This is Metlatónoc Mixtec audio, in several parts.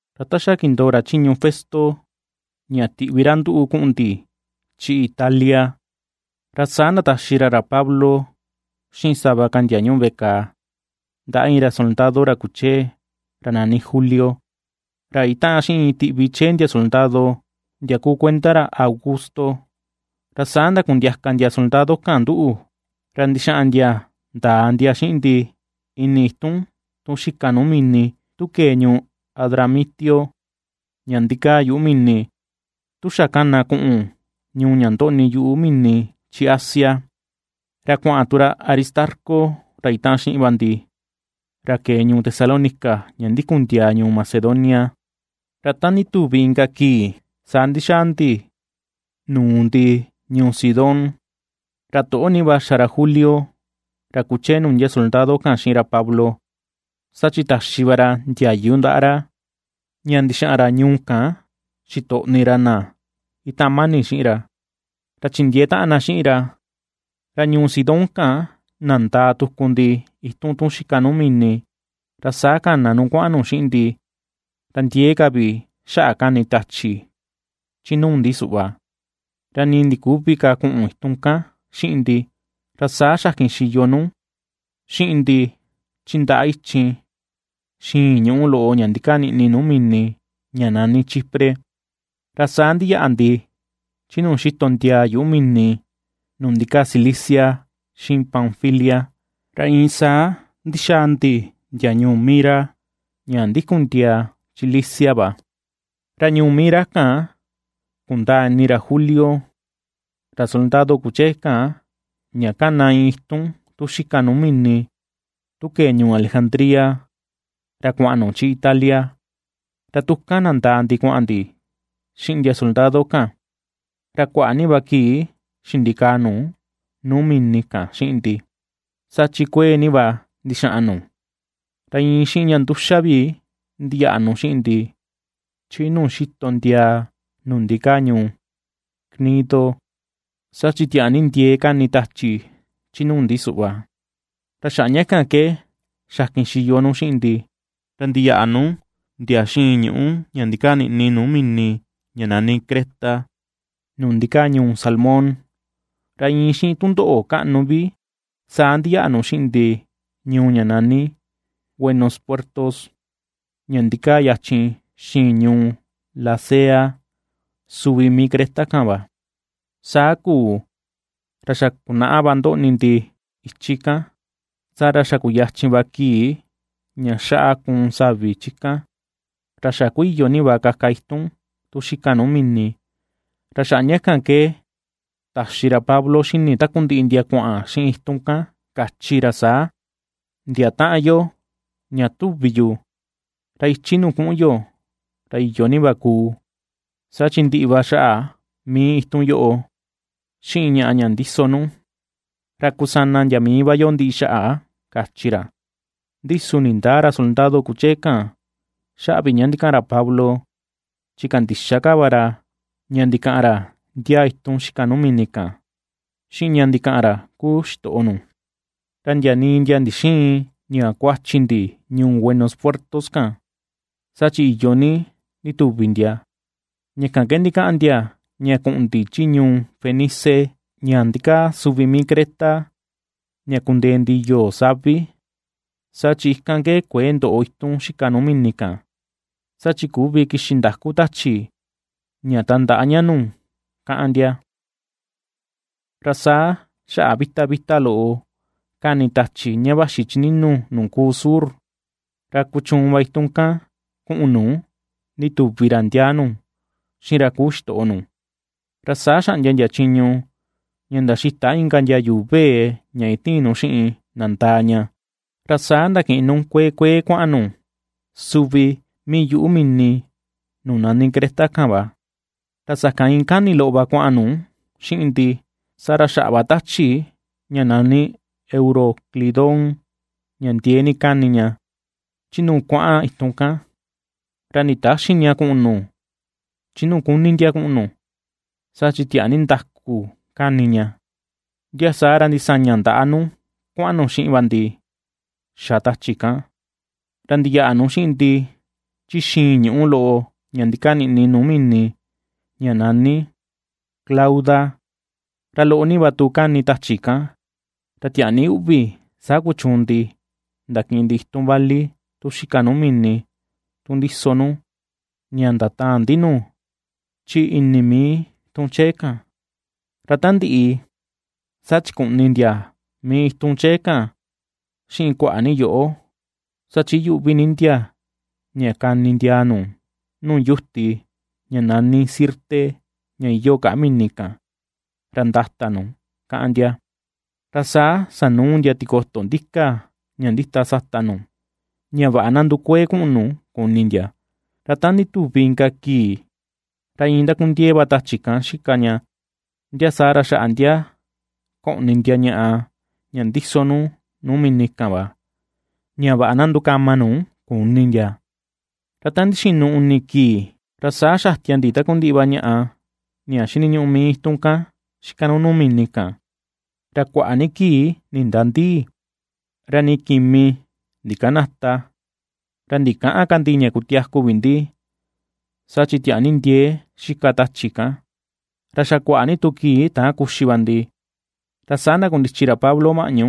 Ra ta xa kindoo ra chiñu Festo ña tiꞌvi ra nduꞌu kuꞌun ndi chi Italia, ra saa ndataxi ra ra Pablo xiꞌin sava ka ndia ñuꞌu veꞌe kàà, ndaꞌa iin ra soldado ra kuchee ra nani Julio, ra itaꞌan xiꞌin iin tiꞌvi chee ndia soldado, ndia kuu kuenda ra Augusto. Ra saa ndakundiaka ndia soldado kan nduꞌu, ra ndixaꞌan ndia ndaa ndia xiꞌin ndi, ini itun tun xika nuu mini tu kee ñuu Adramitio ña ndikaa yuꞌu mini, tu xa kana kuꞌun ñuu ña ndoꞌni yuꞌu mini chi Asia. Ra kuaꞌan tu ra Aristarco ra itaꞌan xiꞌin va ndi, ra kee ñuu Tesalónica ña ndikun ndiaa ñuu Macedonia. Ra ta ndituvi inka kii saa ndixaa ndi nuu ndi ñuu Sidón. Ra toꞌo ni va xa ra Julio, ra kuchee nuu ndia soldado kan xiꞌin ra Pablo, saa chi taxi va ra ndiayu ndaꞌa ra ña ndixaꞌan ra ñuu kan xitoꞌni ra na itaꞌan mani xiꞌin ra, ra chindiee taꞌan na xiꞌin ra. Ra ñuu Sidón kan, nandaa tuku ndi itun tun xika nuu mini, ra saa kana nu kuaꞌan nu xiꞌin ndi; ra ndiee ka vi xaꞌa kani tachi, chi nuu ndi suꞌva, ra ni ndiküvi ka kuꞌun itun kan xiꞌin ndi, ra saa xakin xiyo nu xiꞌin ndi chi ndaꞌa ichin xiin ñuꞌu loꞌo ña ndikaa niꞌi nuu mini ña nani Chipre. Ra saa ndiyaꞌa ndi chi nuu xitondiaa yuꞌu mini nuu ndikaa Cilicia xiꞌin Panfilia, ra iin saa ndixaa ndi ndia ñuu Mira, ña ndikun ndiaa chi Licia va. Ra ñuu Mira kan kundaa ini ra Julio, ra soldado kuchee kan, ña kana iin itun tu xika nuu mini tu kee ñuu Alejandría ra kuaꞌan nu chi Italia. Ra tu kan nandaa ndi kuaꞌan ndi xiꞌin ndia soldado kan. Ra kuaꞌa ni va kii xindikaa nu nuu mini kan xiꞌin ndi, saa chi kuee ni va ndixaꞌan nu. Ra iin xiꞌin ña nduxa vi ndiyaꞌa nu xiꞌin ndi, chi nuu xitondiaa nuu ndikaa ñuu Gnido. Saa chi tiaa ni ndiee kani tachi chi nuu ndi suꞌva, ra xaꞌa ña kan ke xakin xiyo nu xiꞌin ndi, ra ndiyaꞌa nu ndia xiin ñuꞌu ña ndikaa niꞌni nuu mini ña nani Creta, nuu ndikaa ñuu Salmón. Ra iin xiꞌin tundoꞌo kaꞌnu vi saa ndixaa nu xiꞌin ndi ñuu ña nani Buenos Puertos, ña ndikaa yachin xiꞌin ñuu Lasea, suvi mii Creta kan va. Saa kuu, ra xa kunaꞌa va ndoꞌni ndi ichi kan, saa ra xa kuyachin va kii ña xaꞌa kuun savi chi kan, ra xa ku iyo va kaka itun tu xikan nuu mini. Ra xaꞌa ña kan ke taxi ra Pablo xini takundiꞌi ndia kuaꞌan xiꞌin itun kan, kachi ra saa: ―Ndia taꞌan yo, ña tuvi yu, ra ichi nuu kuꞌun yo ra iyo ni va kuu. Saa chi ndiꞌi va xaꞌa mii itun yoꞌo, xiꞌin ñaꞌa ña ndiso nu, ra kusana ndia mii va yo ndiꞌi xaꞌa ―kachi ra. Ndi su ndindäa ra soldado kuchee kan, xaꞌa vi ña ndikaꞌan ra Pablo. Chi kandixa ka va ra ña ndikaꞌan ra ndiaa itun xika nuu mini kan, xiꞌin ña ndikaꞌan ra kuu xitoꞌo nu. Ra ndia nii ndia ndixïin ña kuachi ndi ñuu Buenos Puertos kan, saa chi iyo ni ndituvi ndia, ña kan ke ndikaꞌan ndia ña kuꞌun ndi chi ñuu Fenice ña ndikaa suvi mii Creta ña kundee ndi yoo savi, saa chi ikan ke kuëe ndoꞌo itun xika nuu mini kan, saa chi küvi kixi ndaku tachi ña tandaꞌa ña nu kaꞌan ndia. Ra saa xaꞌa vita vita loꞌo kani tachi ña vaxi chi ninu nuu kuu sur, ra kuchuun va itun kan kuꞌun nu, ndituvi ra ndiaa nu xiꞌin ra kuu xitoꞌo nu. Ra saa xaꞌndia ndia chiñu ña ndaxita inka ndia yuu vee ña itiin nu xiꞌin nandaa ña. Ra saa ndakiꞌin nu kuee kuee kuaꞌan nu suvi mii yuꞌu mini nuu nani Creta kan va. Ra sakan iin kani loꞌo va kuaꞌan nu xiꞌin ndi, saa ra xaꞌa va tachi ña nani Euroclidón ña ndiee ni kani ña, chi nuu kuaꞌan itun kan. Ra nditäxi ña kuꞌun nu chi nuu kuni ndia kuꞌun nu, saa chi tiaa ni ndaku kani ña. Ndia saa ra ndisaña ndaꞌa nu kuaꞌan nu xiꞌin va ndi xa tachi kan. Ra ndiyaꞌa nu xiꞌin ndi chi xiin ñuꞌu loꞌo ña ndikaa niꞌni nuu mini ñani Clauda, ra loꞌo va tu kani tachi kan, ra tiaa ni uꞌvi saa kuchuun ndi, ndakiꞌin ndi itun vali tu xika nuu mini tun ndiso nu, ña ndataan ndi nu chi ini mii tun chee kan. Ra ta ndiꞌi, saa chikuꞌni ndia mii itun chee kan, xiꞌin kuaꞌa ni yoꞌo, saa chi iyuꞌvi ni ndia ña kani ndiaa nuu nu yuti ña nani Sirte ña iyoo kaꞌa mini kan, ra ndata nu, káꞌán ndia. Ra saa sanuu ndia tikoto ndika ña ndita sata nu, ña vaꞌa na ndukuee kuꞌun nu, kuni ndia. Ra ta ndituvi inka kii, ra iin ndakundiee va tachi kan xika ña. Ndia saa ra xaꞌa ndia koꞌni ndia ñaꞌa ña ndiso nu nuu mini kan va, ña vaꞌa na ndukama nu, kuni ndia. Ra ta ndixinu uni kii, ra saa xatia ndi takundiꞌi va ñaꞌa ña xiniñuꞌu mii itun xika nuu mini kan. Ra kuaꞌa ni kii nindändii, ra ni kimi ndikanäta, ra ndikäꞌan ka ndi ña kutiaku vi ndi, saa chi tiaa ni ndiee xika tachi kan. Ra xa kuaꞌa ni tu kii täan kuxi va ndi, ra saa ndakundichi ra Pablo maꞌñu,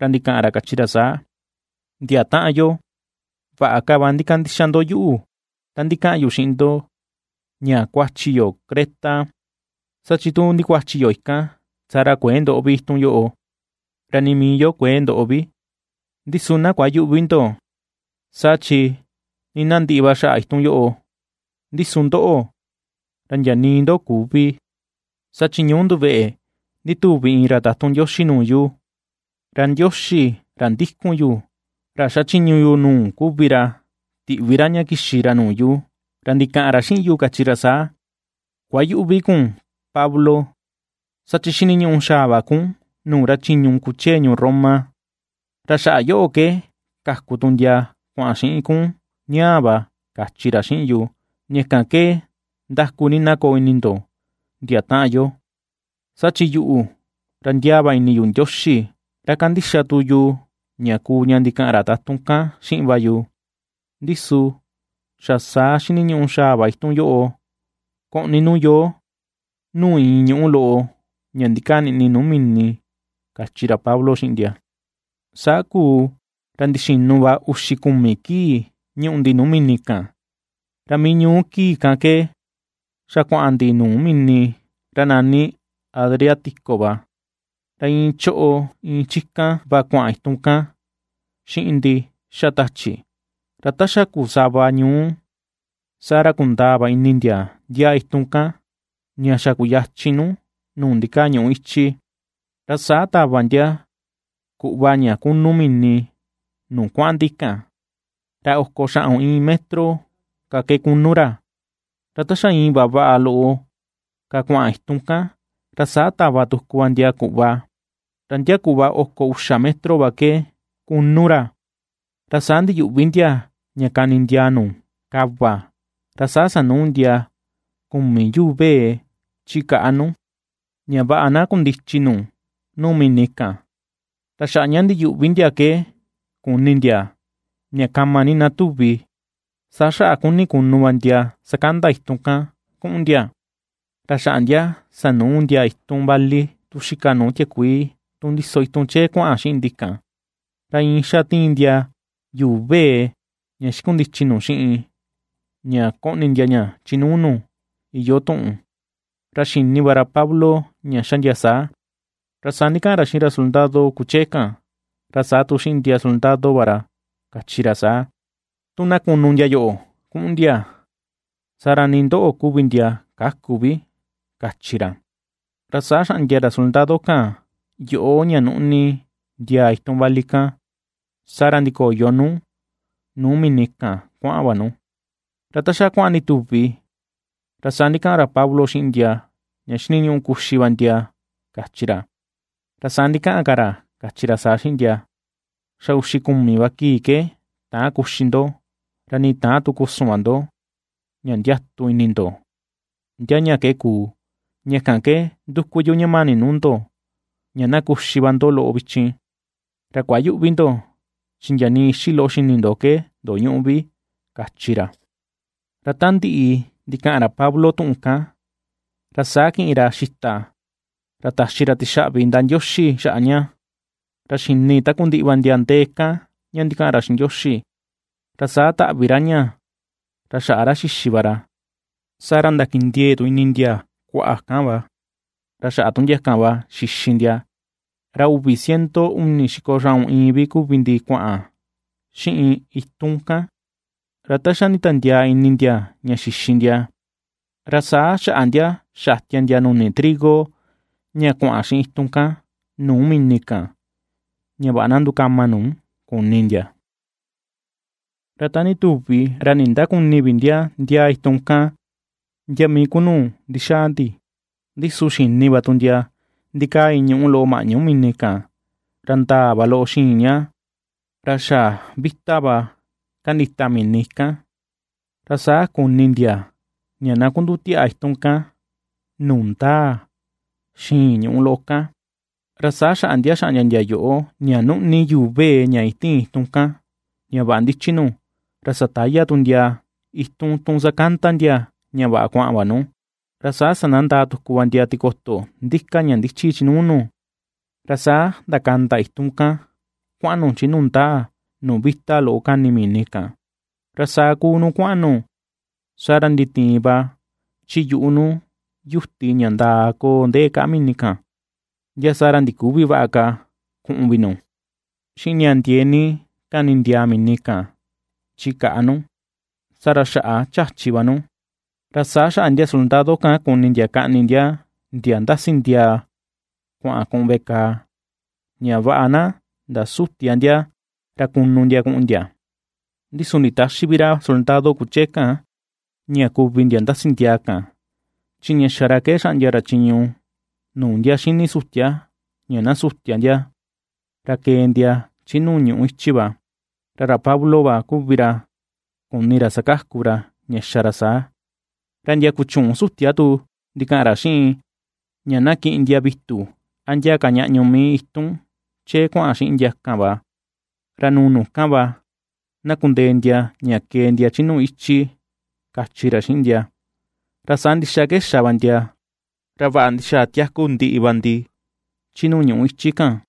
ra ndikaꞌan ra kachi ra saa: ―Ndia taꞌan yo, vaꞌa ka va ndikandixa ndo yuꞌu tan ndikaꞌan yu xiꞌin ndo ña kuachi yo Creta, saa chi tu ndikuachi yo ikan, saa ra kuëe ndoꞌo vi itun yoꞌo, ra nii mii yo kuëe ndoꞌo vi. Ndi su na kuayüꞌvi ndo, saa chi nii na ndiꞌi va xaꞌa itun yoꞌo, ndi su ndoꞌo, ra ndia nii ndo küvi. Saa chi ñuu nduveꞌe ndituvi iin ra tatun Ndioxi nuu yu, ra Ndioxi ra ndikun yu, ra xachiñu yu nuu kuvi ra, tiꞌvi ra ña kixi ra nuu yu, ra ndikaꞌan ra xiꞌin yu kachi ra saa: “Kuayüꞌvi kun, Pablo, saa chi xiniñuꞌu xaa va kun nuu ra chiñu kuchee ñuu Roma, ra xaꞌa yoꞌo ke kaku tu ndia kuaꞌan xiꞌin kun ñaꞌa va”, kachi ra xiꞌin yu. Ña kan ke ndaku ni na koo ini ndo, ndia taꞌan yo. Saa chi yuꞌu, ra ndiaa va ini yu Ndioxi, ra kandixa tu yu ña kuu ña ndikaꞌan ra tatun kan xiꞌin va yu. Ndi su xa saa xiniñuꞌu xaa va itun yoꞌo koꞌni nu yoo nuu iin ñuꞌu loꞌo ña ndikaa niꞌni nuu mini ―kachi ra Pablo xiꞌin ndia. Saa kuu ra ndixinu va uxi kumi kii ñuꞌu ndi nuu mini kan, ra mii ñuu kii kan ke xa kuaꞌan ndi nuu mini ra nani Adriático va, ra iin choꞌo iin chi kan va kuaꞌan itun kan xiꞌin ndi xa tachi, ra ta xa kuu sava ñuu saa ra kundaa va ini ndia ndiaa itun kan ña xa kuyachin nu nuu ndikaa ñuꞌu ichi. Ra saa tava ndia kuꞌva ña kunu mini nuu kuaꞌan ndi kan, ra oko xaꞌun iin metro ka ke kunu ra, ra ta xa iin vaꞌa vaꞌa loꞌo ka kuaꞌan itu kan, ra saa tava tuku va ndia kuꞌva, ra ndia kuꞌva oko uxa metro va ke kunu ra. Ra saa ndiyuꞌvi ndia ña kani ndiaa nu kava, ra saa sanuu ndia kumi yuu vee chi kaꞌa nu, ña vaꞌa na kundichi nu nuu mini kan, ra xaꞌa ña ndiyuꞌvi ndia ke kuni ndia ña kama ni na tuvi. Saa xaꞌa ^kuni kunu va ndia sakanda itun kan kuꞌun ndia, ra xaꞌa ndia sanuu ndia itun vali tu xika nu tiakuii tun ndiso itun chee kuaꞌan xiꞌin ndi kan; ra iin ^xa tiin ndia yuu vee ña xikundichi nu xiꞌin ña koꞌni ndia ña chi nuu nu, iyoo tuꞌun. Ra xini va ra Pablo ña xa ndia saa. Ra saa ndikaꞌan ra xiꞌin ra soldado kuchee kan, ra saa tu xiꞌin ndia soldado va ra, kachi ra saa: ―Tu na kunu ndia yoꞌo kuꞌun ndia, saa ra nii ndoꞌo kuvi ndia käku vi ―kachi ra. Ra saa xaꞌndia ndia soldado kan yoꞌo ña nuꞌni ndiaa itun vali kan, saa ra ndikoyo nu nuu mini kan kuaꞌan va nu. Ra ta xa kuaꞌan ndituvi, ra saa ndikaꞌan ra Pablo xiꞌin ndia ña xiniñuꞌu kuxi va ndia kachi ra, ra saa ndikaꞌan ka ra kachi saa xiꞌin ndia: ―Xa uxi kumi va kii ke täan kuxi ndo, ra ni täan tu kusun va ndo, ña ndiatu ini ndo, ndia ña ke kuu. Ña kan ke ^nduku yu ña mani nuu ndo, ña na kuxi va ndo loꞌo vichin, ra kuayüꞌvi ndo, chi ndia nii ixi loꞌo xini ndo ke ndoñüꞌu vi ―kachi ra. Ra ta ndiꞌi ndikaꞌan ra Pablo tuꞌun kan, ra saa kiꞌin ra xita ra taxi tixaꞌvi ndaꞌa Ndioxi xaꞌa ña, ra xini takundiꞌi va ndia ndee kan ña ndikaꞌan ra xiꞌin Ndioxi, ra saa taꞌvi ra ña ra xaꞌa ra xixi va ra. Saa ra ndakindiee tu ini ndia kuaꞌa kan va, ra xaꞌa tu ndia kan va xixi ndia. Ra uvi ciento uni xiko xaꞌun iin vi kuvi ndi kuaꞌan xiꞌin itun kan. Ra ta xa nditiandiaa ini ndia ña xixi ndia, ra saa xaꞌa ndia xatia ndia nuni trigo ña kuaꞌan xiꞌin itun kan nuu mini kan, ña vaꞌa na ndukama ka nu, kuni ndia. Ra ta ndituvi, ra nindäkuni vi ndia, ndia itun kan ndia mii ku nuu ndixaa ndi. Ndi su xini va tu ndia ndikaa iin ñuꞌu loꞌo maꞌñu mini kan, ra ndaa va loꞌo xiin ña, ra xa vita va kandita mini ikan, ra saa kuni ndia ña na kundutiaꞌa itun kan, nuu ndaa xiin ñuꞌu loꞌo kan. Ra saa xaꞌa ndia xaꞌndia ndia yoꞌo, ña nuꞌni yuu vee ña itiin itun kan ña vaꞌa ndichi nu, ra sataya tu ndia itun tun sakanda ndia ña vaꞌa kuaꞌan va nu. Ra saa sandandaa tuku va ndia tikoto ndika ña ndichi chi nuu nu, ra saa ndakanda itun kan kuaꞌan nu chi nuu ndaa, nuu vita loꞌo kani mini kan. Ra saa ^kuu nu kuaꞌan nu, saa ra nditiin va chi yuꞌu nu yuti ña ndakoo ndee kaꞌa mini kan, ndia saa ra ndiküvi vaꞌa ka kuꞌun vi nu. Ra xiꞌin ña ndiee ni kani ndiaa mini kan chi kaꞌa nu, saa ra xaꞌa chachi va nu. Ra saa xaꞌa ndia soldado kan kuni ndia kaꞌni ndia, ndia ndasi ndiaa kuaꞌan kuꞌun veꞌe kàà, ña vaꞌa na ndasütia ndia ra kunu ndia kuꞌun ndia. Ndi su nditäxi vi ra soldado kuchee kan, ña kuvi ndia ndasi ndiaa kan, chi ña xa ra ke xaꞌndia ra chiñu nuu ndia xini sutia, ña na sutia ndia, ra kee ndia chi nuu ñuꞌu ichi va. Ra ra Pablo va kuvi ra kuni ra sakaku ra ña xa ra saa. Ra ndia kuchüun sutia tu ndikaꞌan ra xiꞌin, ña na kiꞌin ndia vitu a ndia ka ñaꞌñu mii itun chee kuaꞌan xiꞌin ndi kan va, ra nuu nu kan va na kundee ndia ña kee ndia chi nuu ñuꞌu ichi, kachi ra xiꞌin ndia. Ra saa ndixa ke xa va ndia, ra vaꞌa ndixaa tiaku ndiꞌi va ndi, chi nuu ñuꞌu ichi kan.